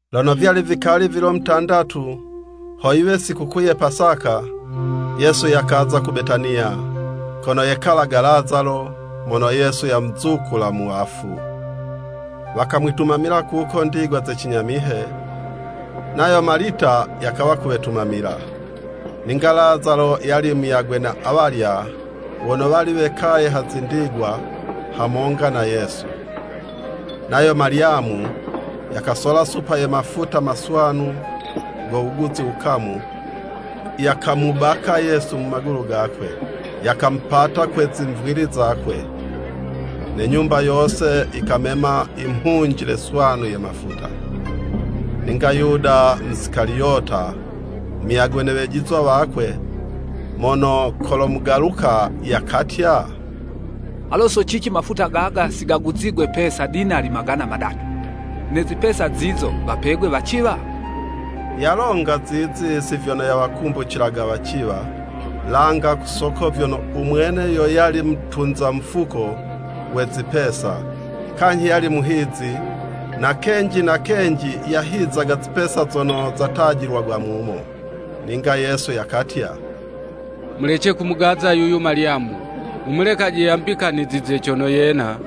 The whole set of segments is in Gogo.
Lono vyali vikali vilo mutandatu, ho yiwe sikukuu ye Pasaka, Yesu yakaza ku Betaniya, kono yekalaga Lazalo, mono Yesu yamuzukula mu wafu. Wakamwitumamila kuko ndigwa za cinyamihe, nayo Malita yakawa kuwetumamila. Ninga Lazalo yali muyagwe na awalya wono wali wekaye ha zindigwa hamonga na Yesu. Nayo Malyamu yakasola supa ye mafuta maswanu, go wuguzi wukamu, yakamubaka Yesu mu magulu gakwe, yakamupata kwe zimvili zakwe. Ne nyumba yose yikamema imhunjile swanu ye mafuta. Ninga Yuda Musikaliyota, muyagwe ne wejizwa wakwe, mono kolomugaluka, yakatya, “Alo so cici mafuta gaga si gaguzigwe pesa dinali magana madatu, ne zipesa zizo wapegwe waciwa?” Yalonga zizi si vyono yawakumbucilaga waciwa, langa ku soko vyono u mwene yo yali mutunza mufuko we zipesa, kanyhi yali muhizi, na kenji na kenji, yahizaga zipesa zono zatajilagwa mumo. Ninga Yesu yakatya, “Mulece kumugaza yuyu Malyamu. Mumulekaje yambikanizize cono yena,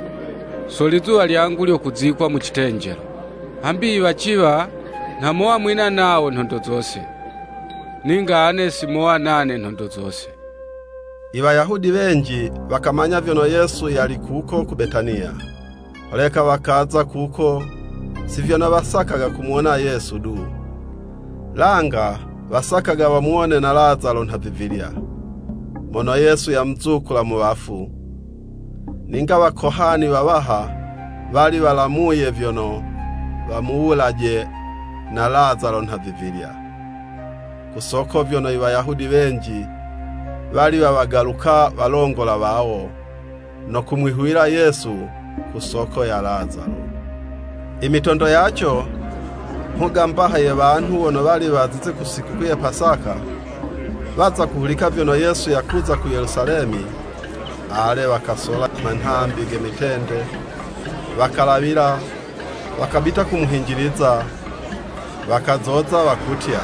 so lizuwa lyangu lyo kuzikwa mu citenjelo. Hambi i waciwa nha mowa mwina nawo nhondo zose. Ninga ane si mowa nane nhondo zose.” Iwayahudi wenji, wakamanya vyono Yesu yali kuko ku Betaniya, holeka wakaza kuko, si vyono wasakaga kumuwona Yesu du, langa wasakaga wamuwone na Lazalo nhavivilya, mono Yesu yamuzukula mu wafu. Ninga Wakohani wawaha wali walamuye vyono, wamuwulaje na Lazalo nhavivilya. Ku soko vyono, Iwayahudi wenji, wali wawagaluka walongola wawo, no kumwihuwila Yesu, ku soko ya Lazalo. Imitondo yaco, mhuga mbaha ye wanhu wono wali wazize ku sikukuu ye Pasaka, waza kuhulika vyono Yesu yakuza ku Yelusalemi, ale, wakasola i manhambi ge mitende, wakalawila, wakabita kumuhinjiliza, wakazoza wakutya,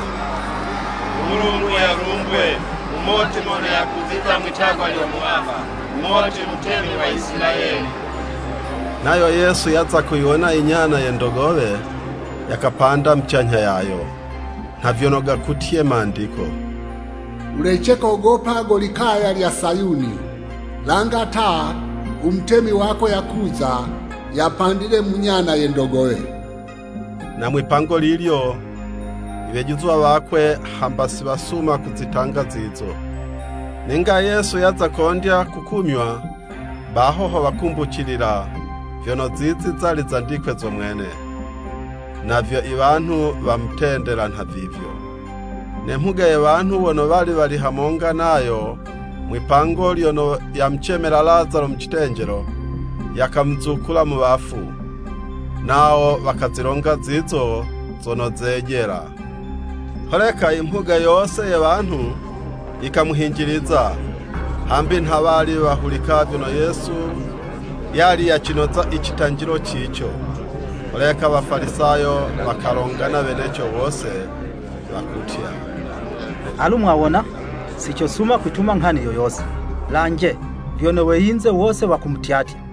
“U Mulungu yalumbwe! Mumoti mono yakuziza mwitagwa lyo Muwaha. Mumoti mutemi wa Isilayeli.” Nayo Yesu yaza kuyiwona inyana ye ndogowe, yakapanda mucanyha yayo, nha vyono gakutye Mandiko, “Wulece kogopa go likaya lya Sayuni. Langa ta, u Mutemi wako yakuza. Yapandile mu nyana ye ndogowe.” Na mwipango lilyo iwejizwa wakwe hamba si wasuma kuzitanga zizo. Ninga Yesu yaza kondya kukumywa, baho ho wakumbucilila vyono zizi zali zandikwe zo mwene, na vyo iwanhu wamutendela nhavivyo. Ne mhuga ye wanhu, wono wali wali hamonga nayo mwi'pango lyono yamucemela Lazalo mu citenjelo, yakamuzukula mu wafu, nawo wakazilonga zizo zono zejela. Holeka imhuga yose ye wanhu, yikamuhinjiliza, hambi nha wali wahulika vyono Yesu yali yacinoza i citanjilo cico. Holeka Wafalisayo wakalongana weneco wose, wakutya, “Alu mwawona! Si cosuma kwituma nghani yo yose! Lanje, vyono we yinze wose wakumutyatya.”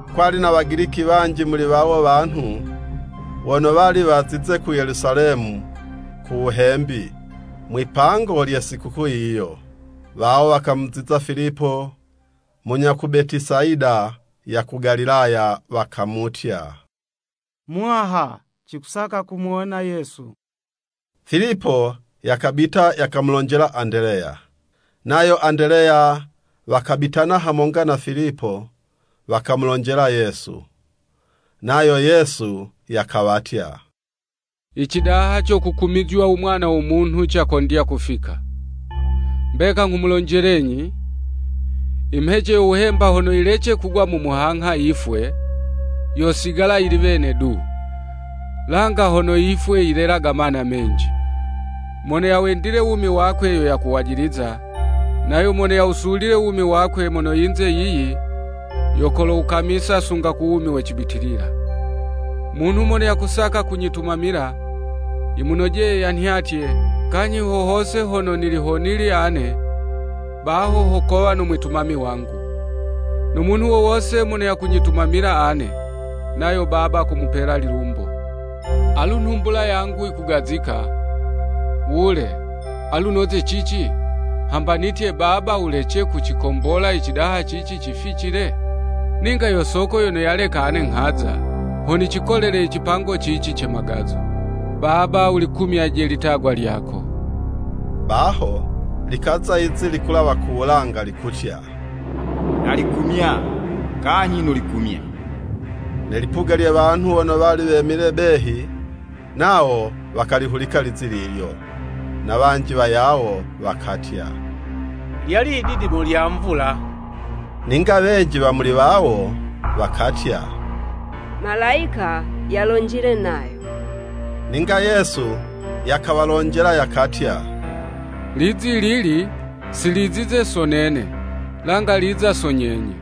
Kwali na Wagiliki wanji muli wawo wanhu, wano wali wazize ku Yelusalemi ku wuhembi, mwipango lye Sikukuu yiyo. Wawo wakamuziza Filipo, (munya ku Betesayida ya ku Galilaya,) wakamutya, “Muwaha, cikusaka kumuwona Yesu.” Filipo yakabita, yakamulonjela Andeleya. Nayo Andeleya wakabitana hamonga na Filipo, wakamulonjela Yesu. Nayo Yesu yakawatya, “Icidaha co kukumizywa u Mwana wo Munhu, cakondya kufika! Mbeka nghumulonjelenyi, imhece yo wuhemba, hono yilece kugwa mu muhangha yifwe, yosigala yili wene du. Langa hono yifwe, yilelaga mana menji. Mono yawendile wumi wakwe yo yakuwajiliza, nayo mono yawusulile wumi wakwe mono yinze yiyi, yo kolowukamisa sunga ku wumi we cibitilila. Munhu mono yakusaka kunyitumamila, yimunojeye yanhyatye, kanyhi ho hose hono nili honili ane, baho ho kowa no mwitumami wangu. No munhu wo wose mono yakunyitumamila ane, nayo Baba komupela lilumbo. “Alu nhumbula yangu yikugazika, wule, alu noze cici? Hamba nitye, ‘Baba wulece kucikombola icidaha cici cificile?’ Ninga yo soko yono yaleka ane nghaza, ho nicikolele i cipango cici ce magazo. Baba wulikumyaje litagwa lyako.” Baho likaza lizi likulawa ku wulanga, likutya, “Nalikumya, kanyhi nolikumya.” Ne lipuga lye wanhu wono wali wemile behi, nawo wakalihulika 'lizi lilyo, na wanji wayawo wakatya, “Lyali yididimo lya Mvula.” Ninga wenji wa muli wawo, wakatya, “Malayika yalonjile nayo.” Ninga Yesu yakawalonjela yakatya, “Lizi lili, si lizize so nene, langa liza so nyenye.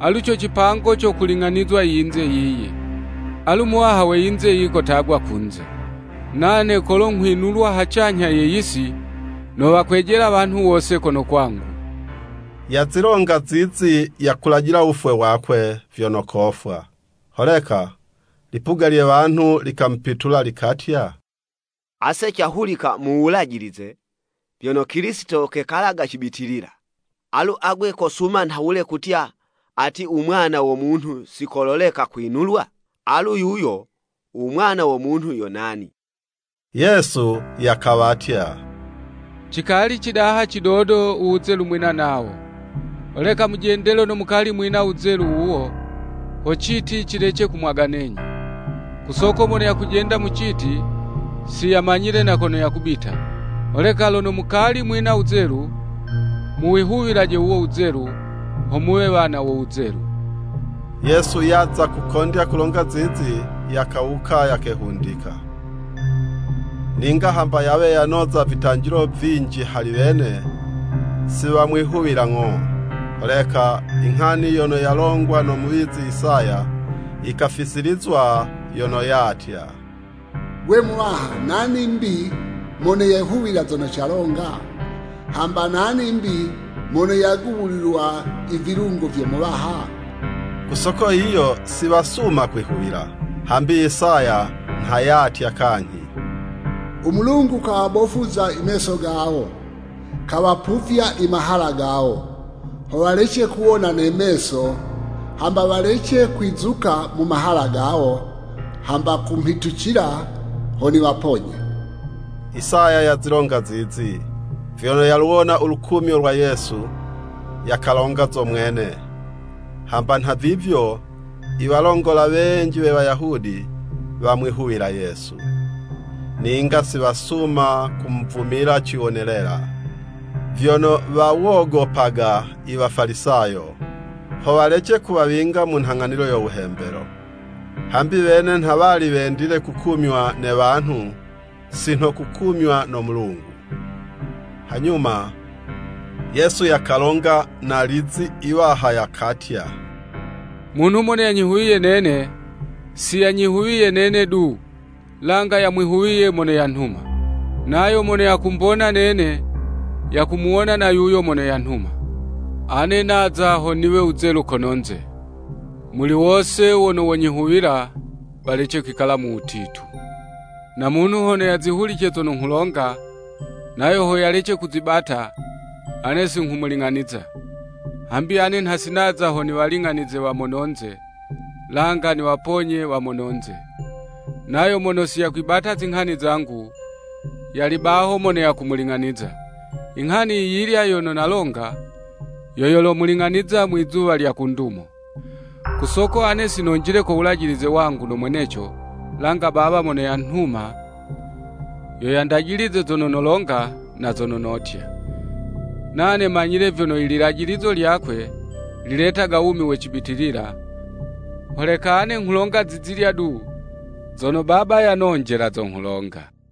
Alu co cipango co kuling'anizwa iyinze yiyi, alu muwaha we yinze yiyi kotagwa kunze. Nane kolo nghwinulwa hacanyha ye yisi, nowakwejela wanhu wose kono kwangu.” (Yazilonga zizi yakulajila wufwe wakwe vyono kofwa.) Holeka lipuga lye wanhu likamupitula, likatya, “Ase cahulika mu Wulajilize, vyono Kilisito kekalaga cibitilila. Alu agwe kosuma nhawule kutya, ati, ‘U Mwana wo Munhu si koleka kwinulwa?’ Alu yuyo u Mwana wo Munhu yo nani.” Yesu yakawatya, “Cikali cidaha cidodo, u wuzelu mwina nawo. Holeka mujende lono mukali mwina wuzelu wuwo, ho citi cilece kumwaganenyi. Ku soko mono yakujenda mu citi, si yamanyile na kono yakubita. Holeka lono mukali mwina wuzelu, muwihuwilaje wuwo wuzelu, ho muwe wana wo wuzelu.” Yesu yaza kukondya kulonga zizi, yakawuka, yakehundika. Ninga hamba yawe yanoza vitanjilo vinji hali wene, si wamwihuwila ng'o. Holeka inghani yono yalongwa no muwizi Isaya, yikafisilizwa, yono yatya: “Gwe, Muwaha, nani'mbi, mono yehuwila zono calonga? Hamba nani 'mbi mono yagubulilwa i vilungo vyo Muwaha?” Ku soko yiyo, si wasuma kwihuwila, hambi Isaya nha yatya kanyhi: “U Mulungu kawabofuza meso gawo, Kawapuvya i mahala gawo Ho walece kuwona ne meso Hamba walece kwizuka mu mahala gawo Hamba kumhitucila ho niwaponye.” Isaya yazilonga zizi, vyono yaluwona ulukumyo lwa Yesu, yakalonga zo mwene. Hamba nhavivyo, iwalongola wenji we Wayahudi, wamwihuwila Yesu. Ninga si wasuma kumuvumila ciwonelela, vyono wawogopaga Iwafalisayo, ho walece kuwawinga mu nhang'anilo yo wuhembelo. Hambi wene nha wali wendile kukumywa ne wanhu si nho kukumywa no Mulungu. Hanyuma, Yesu yakalonga na lizi iwaha, yakatya, “Munhu mono yanyihuwiye nene, si yanyihuwiye nene du, langa yamwihuwiye mono yanhuma.” Nayo mono yakumbona nene, yakumuwona na yuyo mono yanhuma. Ane naza, ho niwe wuzelu kononze, muli wose wono wonyihuwila, walece kwikala mu wutitu. Na munhu hono yazihulice zono nghulonga, nayo ho yalece kuzibata, ane singhumuling'aniza, hambi ane nha si naza ho niwaling'anize wa mononze, langa niwaponye wa mononze. Nayo mono si yakwibata zinghani zangu, yali baho mono yakumuling'aniza, Inghani yiyilya yono nalonga, yo yolomuling'aniza Mwizuwa lya ku Ndumo. Ku soko ane si nonjile ko wulajilize wangu no mweneco, langa Baba mono yanhuma, yo yandajilize zono nolonga na zono notya. Nane manyile vyono ililajilizo lyakwe, liletaga wumi we cibitilila, holeka ane nghulonga zizilya du, zono Baba yanonjela, zo nghulonga.